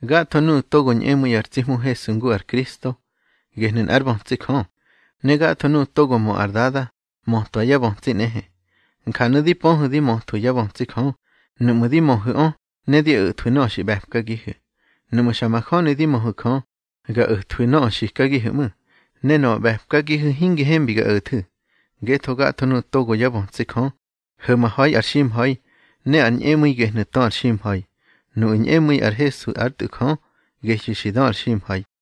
Gatho nuꞌu̱ togo ñꞌemu̱i ar tsi Hmu Hesu ngu ar Kristo, gehnu̱ nꞌár bötsi Jö. Ne gatho nuꞌu̱ togo mö ar dada, mötwa yá bötsi nꞌehe. Njanu̱ di pöhu̱ di möthwu̱ yá bötsi Jö, nuꞌmu̱ di möhu̱ꞌö ne di o̱thwu̱ nöꞌö xi ꞌbe̱pkagihu̱. Nuꞌmu̱ xa majöni di möhu̱ Jö, ga o̱thwu̱ nöꞌö xikagihu̱ ꞌmu̱, ne nöꞌö ꞌbe̱pkagihu̱ hingi hembi ga o̱thu̱. Ngetho gatho nuꞌu̱ togo yá bötsi Jö, ho̱maha̱i ar ximha̱i, ne ar ñꞌemu̱i gehnu̱ tö ar ximha̱i. Nuꞌu̱ ñꞌemu̱i ar Hesu ár Tꞌu̱ Jö, gehyu̱ xi dö ar ximha̱i.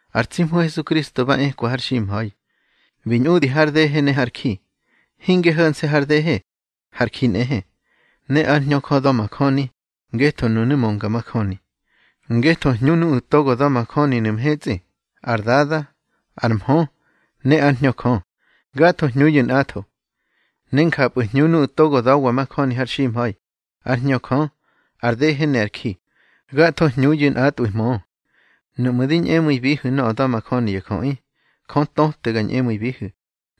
Ar tsi Hmu Hesukristo ba ekwa har ximha̱i, bi ñꞌudi har dehe ne har ji. Hinge ho̱nse̱ har dehe, har ji nꞌehe. Ne ár Hñö Jö da̱majöni, ngetho nunu̱ mönga majöni. Ngetho hñu nuꞌu̱ togo da̱majöninu̱ mhetsꞌi: ar Dada, ar Mhö, ne ár Hñö Jö. Gatho hñuyu̱ nꞌatho. Ne njapꞌu̱ hñu nuꞌu̱ togo da̱wa majöni har ximha̱i: ár Hñö Jö, ar dehe ne ar ji. Gatho hñuyu̱ nꞌatꞌwu̱ mö. Nuꞌmu̱ di ñꞌemu̱ibihu̱ nöꞌö da̱majöni ya jöꞌi, Jö töte ga ñꞌemu̱ibihu̱,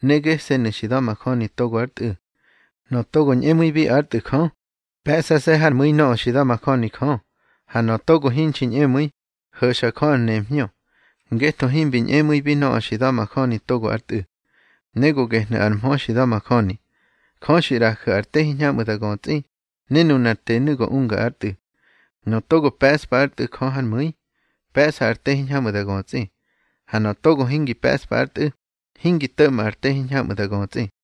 ne gese̱nu̱ xi da̱majöni togo ár Tꞌu̱. Nöꞌö togo ñꞌemu̱ibi ár Tꞌu̱ Jö, pe̱ꞌsase̱ hár mu̱i nöꞌö xi da̱majöni Jö. Ha nöꞌö togo hinxi ñꞌemu̱i, ho̱xa Jö ar nemhñö, ngetho himbi ñꞌemu̱ibi nöꞌö xi da̱majöni togo ár Tꞌu̱. Ne go gehnu̱ ar mhö xi da̱majöni: Jö xi ꞌraju̱ ar te hiñhamꞌu̱ da götsꞌi, ne nunar tenu̱ go unga ár Tꞌu̱. Nöꞌö togo pe̱ꞌspa ár Tꞌu̱ Jö hár mu̱i, pe̱ꞌsa ar te hiñhamꞌu̱ da götsꞌi. Ha nöꞌö togo hingi pe̱ꞌspa ár Tꞌu̱, hingi to̱ꞌma ar te hiñhamꞌu̱ da götsꞌi.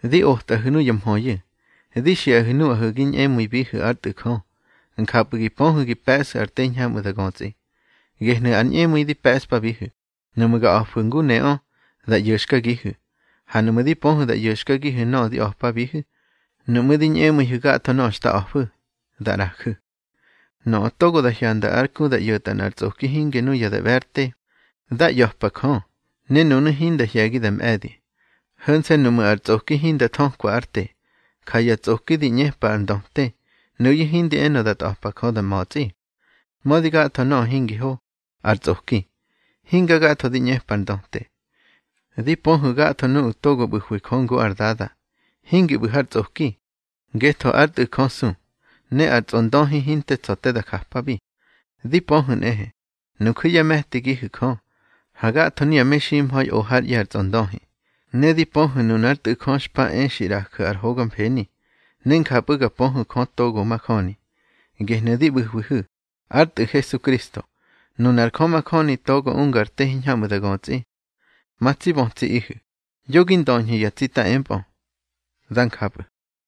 Di otꞌahu̱ nuya mhöyu̱, di xiꞌahu̱ nuꞌahu̱ gi ñꞌemu̱ibihu̱ ár Tꞌu̱ Jö, njapꞌu̱ gi pöhu̱ gi pe̱ꞌsu̱ ar te hiñhamꞌu̱ da götsꞌi. Gehnu̱ ar ñꞌemu̱i di pe̱ꞌspabihu̱, nuꞌmu̱ ga a̱fu̱ ngu neꞌö, da ꞌyo̱xkagihu̱. Ha nuꞌmu̱ di pöhu̱ da ꞌyo̱xkagihu̱ nöꞌö di a̱pabihu̱, nuꞌmu̱ di ñꞌemu̱ihu̱ gatho nöꞌö xta a̱fu̱, da ꞌraju̱. Nöꞌö togo da hyanda ár ku da ꞌyo̱tꞌa nꞌar tsꞌoki hinge nuya da ꞌbe̱ ár te, dá ꞌya̱pa Jö, ne nunu̱ hinda hye̱gi da mꞌe̱di, ho̱nse̱ nuꞌmu̱ ar tsꞌoki hinda thökwa ár te. Ja ya tsꞌoki di ꞌñepa ar ndöte, nuyu̱ hindi enö da tꞌa̱pa Jö da ma̱tsꞌi. Mödi gatho nöꞌö hingi ho, ar tsꞌoki, hinga gatho di ꞌñepa ar ndöte. Di pöhu̱ gatho nuꞌu̱ togo ꞌbu̱hwi Jö ngu ár Dada, hingi ꞌbu̱ har tsꞌoki, ngetho ár Tꞌu̱ Jö su, ne ar tsꞌondöhi hinte tsa̱ te da japabi. Di pöhu̱ nꞌehe, nuju̱ yá me̱tigihu̱ Jö, ha gatho nuya meximha̱i o hár ꞌye̱ ar tsꞌondöhi. Ne di pöhu̱ nunár Tꞌu̱ Jö xpa e xi ꞌraju̱ ar hoga mfeni, ne njapꞌu̱ ga pöhu̱ Jö togo majöni. Gehnu̱ di ꞌbu̱hwihu̱, ár Tꞌu̱ Hesukristo, nunar Jö majöni togo unga ar te hiñhamꞌu̱ da götsꞌi. Ma tsi bötsiꞌihu̱, yo gi ndöñhu̱ ya tsita empꞌö. Dá njapꞌu̱.